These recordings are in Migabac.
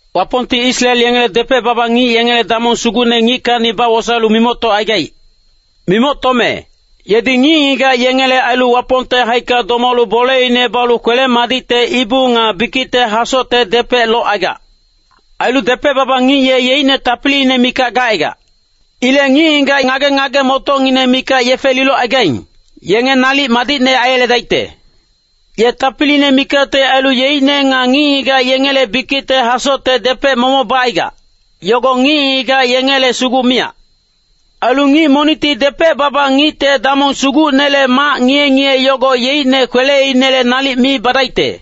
Wapongti Israel yengele depec-baba ngic yengele damong sugucne ngickacni bawosaelu mimoctocaigaic. Mimoctome, yedi ngic-ngigac yengele ailu Wapongte haicka domalu boleine balu kwele-madicte ibu nga bikicte hasocte depec locaigac. Ailu depec-baba ngic ye yeicne tapiliine mikac gacaigac. Ilec ngic-ngigac ngage-ngage-motocngineng mikac yefe lilocaigaing, yenge nalic madicne aiyeledaicte. Ye tapiliine mikacte ailu yeicne nga ngic-ngigac yengele bikicte hasocte depec momoc bacaigac, yogo ngic-ngigac yengele sugu miyac. Ailu ngic monicti depec-baba ngicte damong sugucnele mac ngiye-ngiye yogo yeicne kweleinele nalic mi badaicte.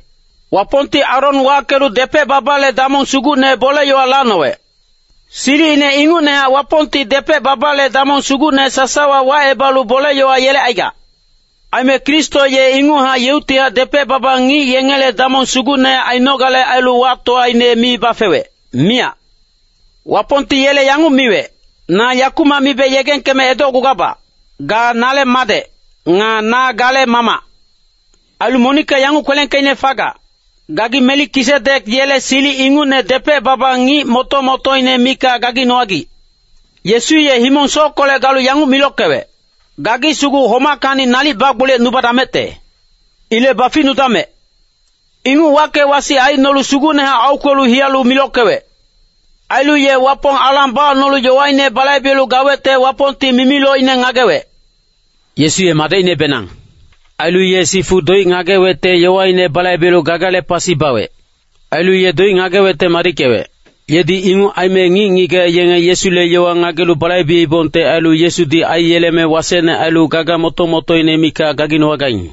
Wapongti Aron wackelu depec-babale damong sugucne bole-yowa lacnowec. Silicine ingucnehac Wapongti depec-babale damong sugucne sasawa wacebalu bole-yowa yelecaigac. Aime Kristo ye inguchac yeuctihac depec-baba ngic yengele damong sugucne ainogale ailu wactowaine mi bafewec, miyac. Wapongti yele yanguc miwec, “Na yakumac mibe yegengkeme edocgugabac, ga nale Madec, nga na gale Mamac.” Ailu monicka yanguc kwelengkeicne fagac, “Gagi Melikisidek yele silic ingucne depec-baba ngic moto-motoine mikac gaginowagic.” Yesu ye himong-sockolec galu yanguc milockewec, “Gagi sugu homackacni nalic bagboliyecnudamecte. Ilec baficnudamec.” Inguc wacke-wasic aicnolu sugucnehac aukwelu hiyalu milockewec. Ailu ye Wapong alang bacnolu yowaine balaibelu gawecte Wapongti mimilocine ngagewec. Yesu ye Madecinebenang. Ailu ye sifu doic ngagewecte yowaine balaibelu gagale pasi bawec. Ailu ye doic ngagewecte madickewec. Yedi inguc aime ngic-ngigac yenge Yesule yowa ngagelu balaibeibongte ailu Yesudi aiyeleme wasecne ailu gaga moto-motoine mikac gaginowagaing.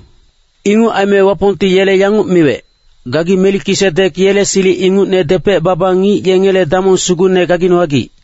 Inguc aime Wapongti yele yanguc miwec, “Gagi Melikisidek yele silic ingucne depec-baba ngic yengele damong sugucne gaginowagic.”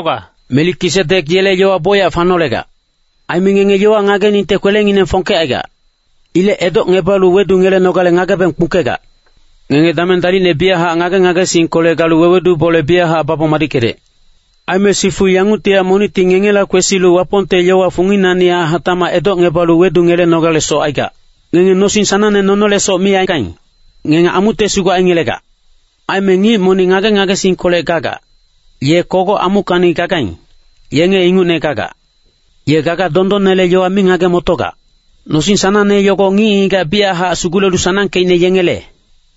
Melikisidek yele yowa bocyac fanolegac. Aime ngenge yowa ngageningte kwelengineng fongkecaigac. Ilec edocngebalu wedungelenogale ngagebeng kpungkegac. Ngenge dameng dalicne biyachac ngage-ngagesingkolec galu wewedu bole biyachac babong madickedec. Aime sifu yanguctihac monicti ngengela kwesilu Wapongte yowa funginacnihac hatacmac edocngebalu wedungelenogalesoc aigac. Ngenge nosing sanangne nonolesoc mi aigaing, ngenge amucte sugu aingelegac. Aime ngic monic ngage-ngagesingkolec gagac, ye kogoc amuckacni gagaing, yenge ingucne gagac. Ye gaga dondonnele yowa mi ngage-motogac. Nosing sanangne yogo ngic-ngigac biyachac sugulelu sanangkeicne yengele.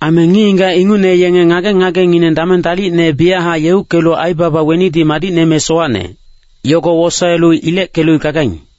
Aime ngic-ngigac ingucne yenge ngage-ngagengineng dameng dalicne biyachac yeuckelu aibaba wenidi madicne me sowacne, yogo wosaelu ileckelu gagaing.